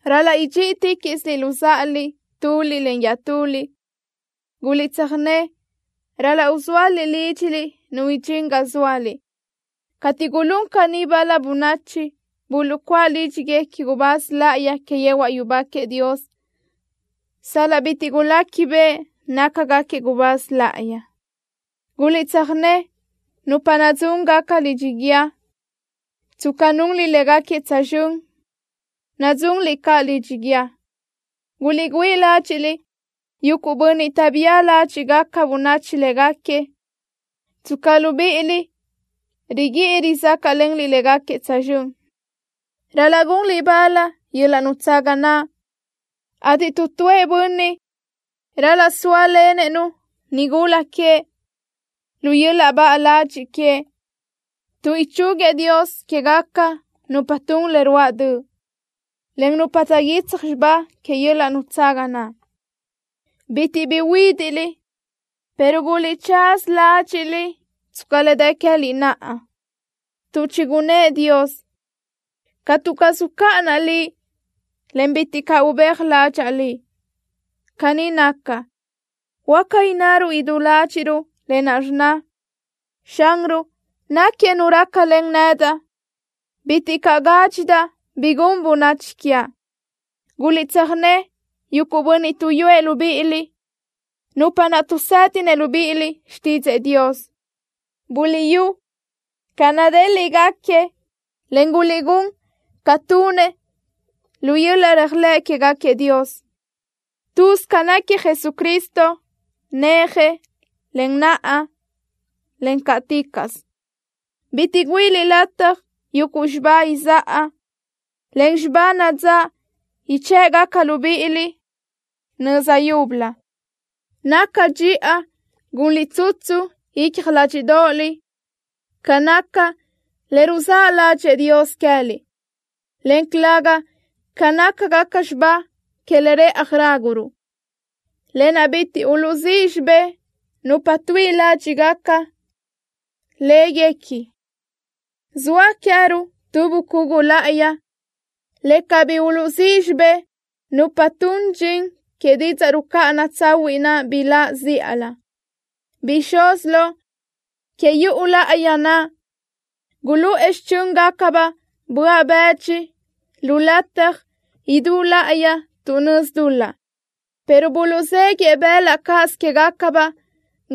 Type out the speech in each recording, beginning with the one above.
Ral-laʼ idxíʼiticaʼsiliʼ luzáʼaliʼ tuliʼ iaʼtuliʼ. Guliʼtsöjné ral-laʼ uzóaliʼ lídxiliʼ nu idxín ga zóaliʼ. Cateʼ gulún caní bal-la bönachi, buluʼcuáʼ lídxiguequi gubáz láʼayi que yehuaʼ yubá queëʼ Dios, sal-laʼ bitiʼ guléquibeʼe nácagaquiëʼ gubáz láʼayi. Guliʼtsöjné nupa nadzúngaca lidxi guíë tsca nunliʼ légaquiëʼ tsözxö́n, nadzunliʼ caʼ lidxi guíë. Guliʼgüíʼ ládxiʼliʼ yuguʼ bönniʼ taʼbía ládxiʼgaca bönachi légaquiëʼ, tsca libíʼiliʼ riguíʼi rizácaʼlenliʼ légaquiëʼ tsözxö́n. Ral-laʼ gunliʼ bal yöl-laʼ nutsaga naʼ, ateʼ tu tuëʼ bönniʼ ral-laʼ sóalenëʼ-nu nigula queëʼ lu yöl-laʼ baʼa ladxiʼ queëʼ, tuʼ ichúguiëʼ Dios quégaca nupa tun le ruáʼ döʼ, en nupa taʼguítsaj xibá que yöl-laʼ nutsaga naʼ. Bitiʼ bi uhuídiʼliʼ, pero guliʼtsaza ládxiʼliʼ tsca le dë queë́liʼ naʼa, tuʼ chigunnë́ʼ Dios: “Catu caz ucáʼanaʼ liʼ, en bitiʼ caʼ ubéaj ládxaʼa liʼ.” Caní naca, huáca innaruʼ idú ládxiʼruʼ lë naʼ rnna: Xanruʼ náquiëʼ Nu rácalen nedaʼ. Bitiʼ caʼ gádxidaʼ bi gun bönachi quiaʼ. Guliʼtsöjné yuguʼ bönniʼ tuʼyúëʼ libíʼiliʼ, nupa naʼ tuʼsédinëʼ libíʼiliʼ xtídzëʼë Dios. Buliʼyú ca nadéliʼgaquiëʼ, en guliʼgún ca tunëʼ lu yöl-laʼ réajlëʼ quégaquiëʼ Dios. Lë́bisö ca náquiëʼ Jesucristo, néaje, en naʼa, en cáʼticaʼsö. Bitiʼ güíʼiliʼ lataj yuguʼ xibá izáʼa, en xibá nadzáʼ ichë́ʼgaca libíʼiliʼ nöza yúbölö. Naca dxiʼa gunliʼ tsutsu icja ládxiʼdoʼoliʼ ca naca le ruzáʼ ládxëʼë Dios queë́liʼ, en calëga ca nácagaca xibá que le rëʼaj ráguruʼ, lë naʼ bitiʼ uluʼzíʼ xibé nupa tuíʼi ládxiʼgaca léguequi. Zoa queë́ruʼ tu bucugu láʼayi, le cabí uluʼzíʼ xibé nupa tun dxin que didzaʼ rucáʼana tsahuiʼ naʼ biláʼ zíʼalö. Bixúz lo que yuʼu láʼayi naʼ guluʼë xichö́ngacabaʼ böaʼ bëdxi lu lataj idú láʼayi tuʼ nözi dul-laʼ, pero buluʼzéguië bëlaʼ cáʼasö quégacabaʼ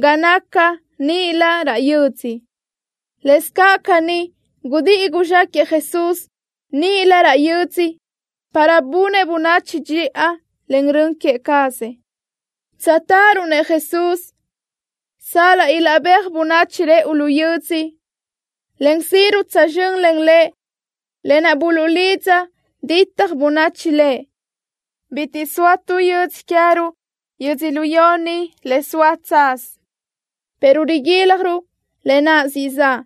ga naca níʼilö raʼ yödzö. Lëscaʼ caní gudíʼi guzxáquëʼë Jesús níʼilö raʼ yödzö para bunëʼ bönachi dxiʼa len rön queë cazëʼ. Tsöjtáʼaruʼ-nëʼ Jesús, sal-laʼ ilaʼbéaj bönachi rëʼu lu yödzö, en síʼiruʼ tsözxö́n len Lëʼ lë naʼ buluʼlidza ditaj bönachi Lëʼ. Bitiʼ zoa tu yödzö queë́ruʼ yödzölió ni le soa tsaz, pero riguíljaruʼ lë naʼ siʼ zaʼ.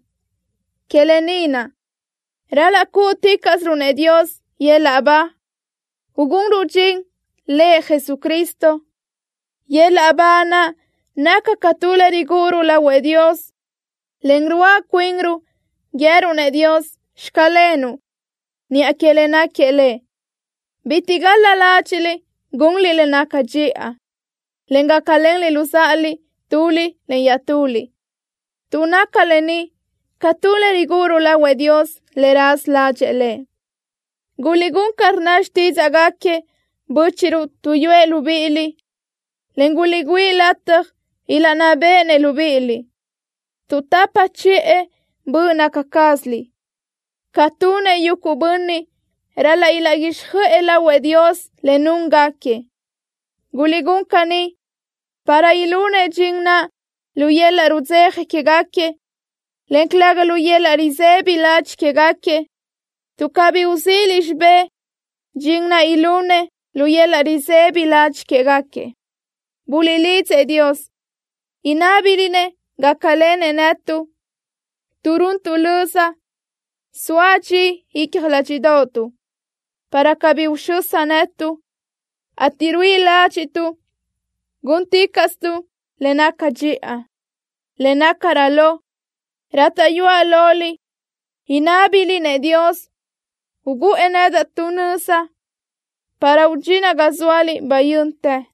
Que lë ni naʼ, ral-laʼ cúʼuticaʼsiruʼ-nëʼ Dios yöl-laʼ ba, ugunruʼ dxin Lëʼ Jesucristo. Yöl-laʼ ba naʼ naca ca tu le rigúʼuruʼ lahuëʼ Dios. Len ruáʼa cuinruʼ guië́ruʼ-nëʼ Dios: “Xclenuʼ” niʼa que le náquiëʼ Lëʼ. Bitiʼ gal-la ládxiʼliʼ gunliʼ le naca dxiʼa, en gácalenliʼ luzáʼaliʼ tuliʼ iaʼtuliʼ, tuʼ naca lë ni ca tu le rigúʼuruʼ lahuëʼ Dios le raza ládxëʼë Lëʼ. Guliʼgún ca rnna xtídzaʼgaquiëʼ bö́chiʼruʼ tuʼyúëʼ libíʼiliʼ, en guliʼgüíʼ lataj ilaʼnná béʼenëʼ libíʼiliʼ, tuʼ tapa chiʼë böʼ naca cázaliʼ, ca tunëʼ yuguʼ bönniʼ ral-laʼ ilaʼguíxjöʼë lahuëʼ Dios le núngaquiëʼ. Guliʼgún caní para ilunëʼ dxin naʼ lu yöl-laʼ rudzeja quégaquiëʼ, en calëga lu yöl-laʼ risëbi ladxiʼ quégaquiëʼ, tuʼ cabí uzíʼiliʼ xibé dxin naʼ ilunëʼ lu yöl-laʼ risëbi ladxiʼ quégaquiëʼ. Buliʼlidzëʼ Dios, inábiliʼ-nëʼ gácalenëʼ netuʼ, tuʼ runtuʼ löza soa dxi icja ládxiʼdoʼotuʼ, para cabí uxösa netuʼ, ateʼ ruíʼi ládxiʼtuʼ gúnticaʼsituʼ le naca dxiʼa. Le nácarö lo, rátaʼyuaʼ loliʼ inábiliʼ-nëʼ Dios uguʼë nedaʼ tu nöza para udxinaʼ ga zóaliʼ bayö́ntë.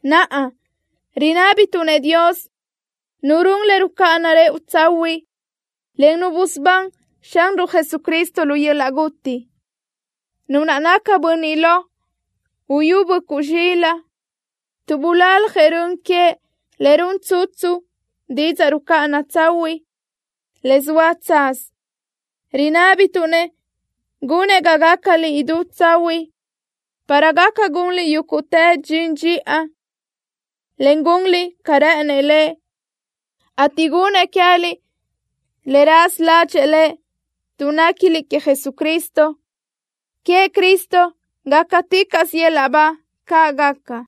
Naʼa, rinábituʼ-nëʼ Dios, Nu run le rucáʼana rëʼu tsahuiʼ, en Nu busubán Xanruʼ Jesucristo lu yöl-laʼ guti, Nu naʼ naca Bönniʼ Lo Uyú Böʼcuʼ Zxilaʼ, tuʼ bulaljëʼ rön queëʼ le run tsutsu didzaʼ rucáʼana tsahuiʼ, le zoa tsaz, rinábituʼ-nëʼ gunëʼ ga gácaliʼ idú tsahuiʼ, para gaca gunliʼ yúguʼtë dxin dxiʼa, en gunliʼ ca rë́ʼënëʼ Lëʼ, ateʼ gunëʼ queë́liʼ le raza ládxëʼë Lëʼ, tuʼ néquiliʼ queëʼ Jesucristo. ¡Queëʼ Cristo gácaticaʼsö yöl-laʼ ba! ¡Caʼ gaca!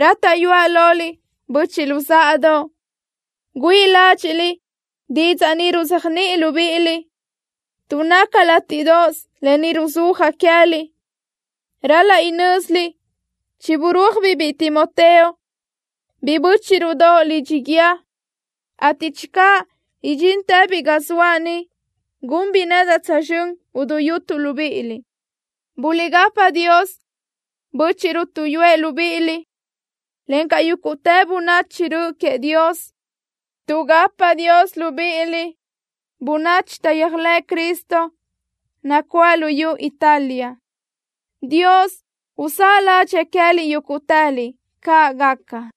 Rátaʼyuaʼ loliʼ, böchiʼ luzáʼadoʼ, güíʼi ládxiʼliʼ didzaʼ ni ruzéajniʼi libíʼiliʼ, tuʼ naca látiʼdoʼos lë ni ruzúajaʼ queë́liʼ. Ral-laʼ inö́ziliʼ chiburúajbiʼ biʼi Timoteo, biʼi bö́chiʼruʼdoʼ, lidxi guíë, ateʼ channö idxíntëbiʼ ga zoaʼ ni, gunbiʼ nedaʼ tsözxö́n uduyútuʼ libíʼiliʼ. Buliʼgapa Dios bö́chiʼruʼ tuʼyúëʼ libíʼiliʼ, encaʼ yúguʼtë bönachi rö queëʼ Dios. Tuʼgapa Dios libíʼiliʼ bönachi taʼyéajlëʼ Cristo nacuáʼ luyú Italia. ¡Dios uzáʼ ládxëʼë queë́liʼ yúguʼtëliʼ! ¡Caʼ gaca!